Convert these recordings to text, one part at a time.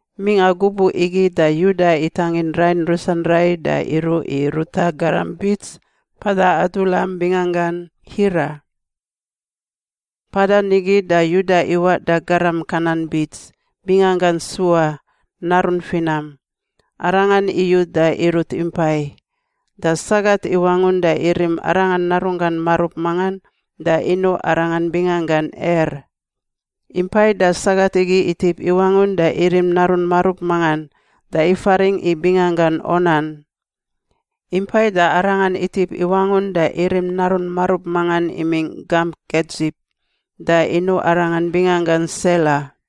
Mingꞌa gubuꞌ igi da Yuda itangin rain rusan rai da iruꞌ i ruta garam bits mpada Adulam binganggan Hira. Mpadan nigi da Yuda iwaꞌ da garam Kanan bits, binganggan Sua, narun finam. Arangan iyu da irut impai. Da sagat iwangun da irim arangan narunggan marub mangan da inuꞌ arangan binganggan Er. Impai da sagat igi itip iwangun da irim narun marub mangan da ifaringꞌ i binganggan Onan. Impai da arangan itip iwangun da irim narun marub mangan imingꞌ gamp Kedzib da inuꞌ arangan binganggan Sela.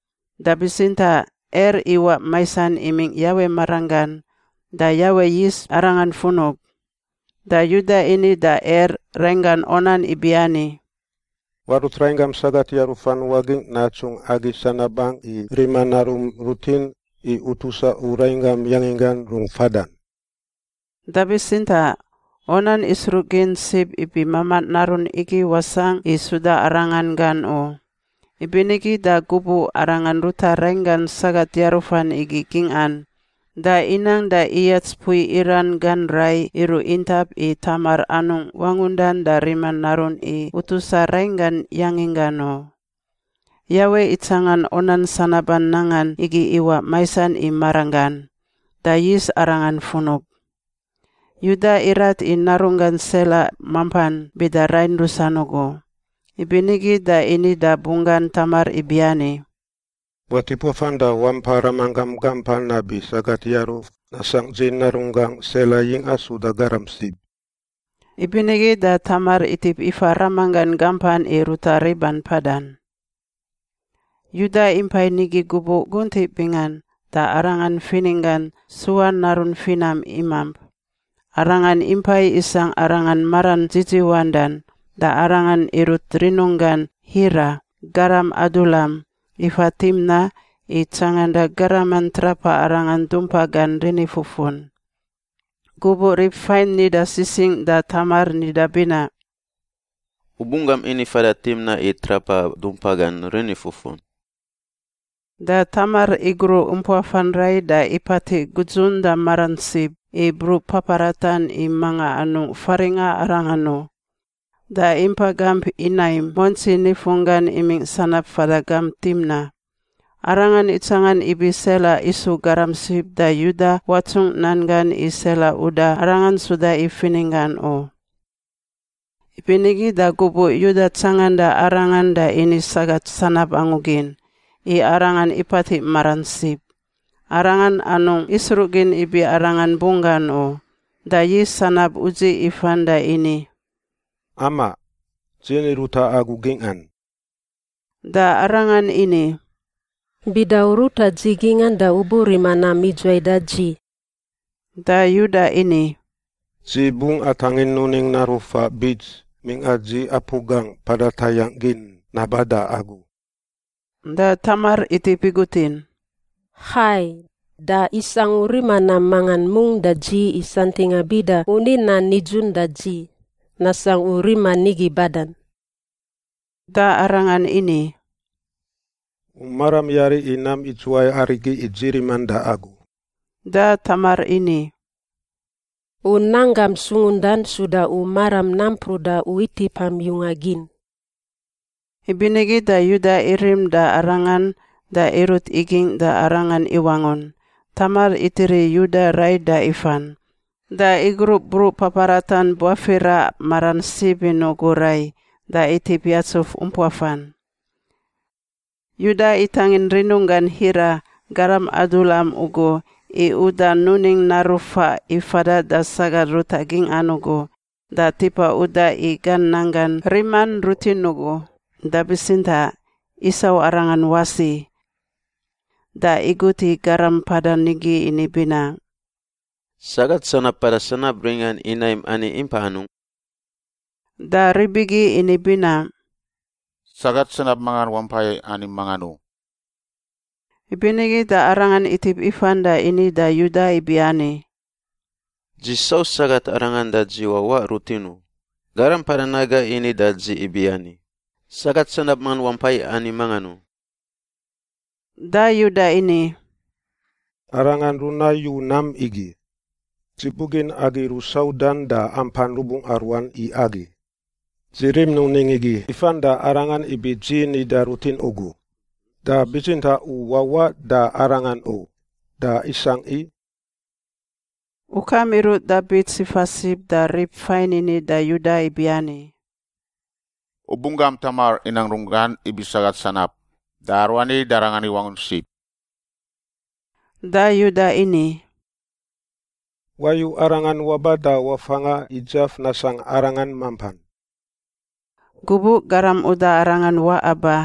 Da bitsintaꞌ Er iwaꞌ maisan imingꞌ Yawe maranggan da Yawe yis arangan funub. Da Yuda ini da Er rainggan Onan ibiani, “Warut rainggam sagat yarufan wagingꞌ natsungꞌ agi sanabangꞌ, i rima narun rutin i utusa u rainggam yanginggan rungꞌ fadan.” Da bitsintaꞌ Onan isruꞌgin sib ibi mamaꞌ narun igi wasangꞌ i suda arangan gan u, ibinigi da gubuꞌ arangan ruta rainggan sagat yarufan igi gingꞌan da inang da iyats mpui iran gan rai iruꞌ intap i Tamar anungꞌ wangundan da rima narun i utusa rainggan yanginggan u. Yawe itsangan Onan sanaban nangan igi iwaꞌ maisan i maranggan, da yis arangan funub. Yuda irat i narunggan Sela mampan bida rain rusan ugu. Ibinigi da ini da bunggan Tamar ibiani, “Watip wafan da wampa ramanggam gampan nabi sagat yaruf nasangꞌ dzi narunggangꞌ Sela yingꞌa suda garam sib.” Ibinigi da Tamar itip ifa ramanggan gampan i ruta riban mpadan. Yuda impai nigi gubuꞌ guntiꞌ bingan da arangan fininggan, Sua narun finam, imamp. Arangan impai isangꞌ arangan maran dzidziwandan, da arangan irut rinunggan Hira, garam Adulam, ifa Timna i tsanganda garaman trapa arangan dumpa gan rinifufun. Gubuꞌ rib fain nida sisingꞌ da Tamar nida binaꞌ, “U bunggam ini fada Timna i trapa dumpa gan rinifufun,” da Tamar igruꞌ umpuafan rai da ipatiꞌ gudzun da maran sib i bruꞌ paparatan i manga anungꞌ faringꞌa arangan u, da impa gamp Inaim muantsi nifunggan imingꞌ sanab fada gamp Timna. Arangan itsangan ibi Sela isu garam sib da Yuda watsungꞌ nan gan i Sela uda arangan suda i fininggan u. Ibinigi da gubuꞌ Yuda tsanganda arangan da ini sagat sanab angu gin, i arangan ipatiꞌ maran sib. Arangan anungꞌ isruꞌgin ibi arangan bunggan u, da yis sanab udziꞌ ifan da ini, “Amaꞌ. Dzi ni ruta agu gingꞌan.” Da arangan ini, “Bida u ruta dzi gingꞌan da u burima nam idzuwai da dzi?” Da Yuda ini, “Dzi bungꞌ atangin nuning naru faꞌ bits mingꞌa dzi apu gangꞌ mpada tayangꞌ gin naba da agu.” Da Tamar itip igutin, “Hai. Da isangꞌ u rima nam mangan mungꞌ da dzi i santingꞌa bida u ni nan nidzun da dzi, nasangꞌ u rima nigi badan?” Da arangan ini, “U maram yari i nam idzuwai arigi i dzi riman da agu?” Da Tamar ini, “U nanggam sungundan suda u maram nampruꞌ da u itipam yunga gin.” Ibinigi da Yuda irim da arangan da irut igingꞌ da arangan iwangun. Tamar itiri Yuda rai da ifan. Da igruꞌ bruꞌ paparatan buafira maran sib in ugu rai, da itip yatsuf umpuafan. Yuda itangin rinunggan Hira, garam Adulam ugu, i uda nuning naru faꞌ i fada da sagat ruta gingꞌan ugu da tipa uda i gan nanggan riman rutin ugu, da bitsintaꞌ isau arangan wasi. Da igut i garam mpadan nigi ini binaꞌ, “Sagat sanab mpada sanab ringan Inaim ani impa anungꞌ?” Da rib igi ini binaꞌ, “Sagat sanab mangan wampai ani mangan u.” Ibinigi da arangan itip ifan da ini da Yuda ibiani, “Dzi sau sagat arangan da dzi wawaꞌ rutin u. Garam mpadan naga ini da dzi ibiani, ‘Sagat sanab mangan wampai ani mangan u.’” Da Yuda ini, “Arangan runayu nam igi. Dzi bugin agi rusaudan da ampan rubungꞌa ruan i agi. Dzi rim nuning igi ifan da arangan ibi dzi nida rutin ugu. Da bitsintaꞌ u wawaꞌ da arangan u. Da isangꞌ i.” Ukam iruꞌ da bits ifa sib da rib fain ini da Yuda ibiani, “U bunggam Tamar inang runggan ibi sagat sanab. Da aruani da arangan iwangun sib.” Da Yuda ini, “Wayu arangan waba da wafanga i dzaf nasangꞌ arangan mampan.” Gubuꞌ garam uda arangan waꞌa ba,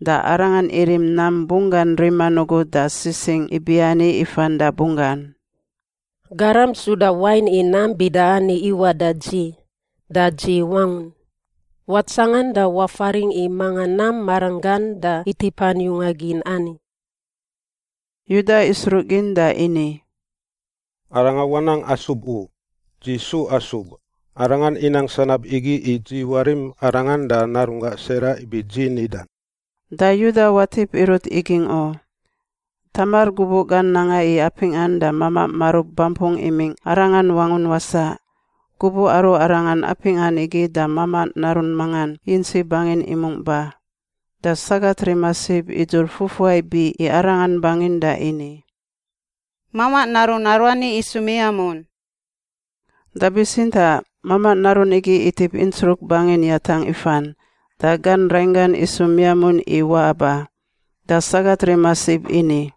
da arangan irim nam bunggan riman ugu da sisingꞌ ibiani ifan da bunggan, “Garam suda wain i nam bida ani iwaꞌ da dzi, da dzi wangun. Watsangan da wafaringꞌ i manga nam maranggan da itipan yunga gin ani.” Yuda isruꞌgin da ini, “Arangan wanang asub u; dzi su asub. Arangan inang sanab igi i dzi warim arangan da narunggangꞌ Sela ibi dzi nidan.” Da Yuda watip irut igingꞌ u. Tamar gubuꞌ gan nanga i apingꞌan da mamaꞌ marub bampungꞌ imingꞌ arangan wangun wasaꞌ. Gubuꞌ aru arangan apingꞌan igi da mamaꞌ narun mangan yintsi bangin imungꞌ ba. Da sagat rima sib idzur fufuai biꞌ i arangan bangin da ini, “Mamaꞌ narun aruani isu miamun.” Da bitsintaꞌ mamaꞌ narun igi itip intsruk bangin yatangꞌ ifan da gan rainggan isu miamun i waꞌa ba, da sagat rima sib ini,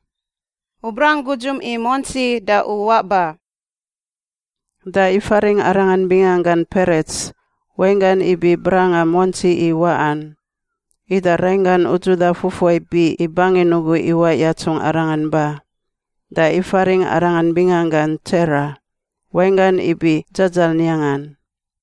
“U brang gudzum i muantsi da u waꞌ ba.” Da ifaringꞌ arangan binganggan Perets (wainggan ibi brangꞌa muantsi i waꞌan). Ida rainggan udzuda fufuai biꞌ i bangin ugu iwaꞌ yatsungꞌ arangan ba. Da ifaringꞌ arangan binganggan Tsera (wainggan ibi dzadzaniangan).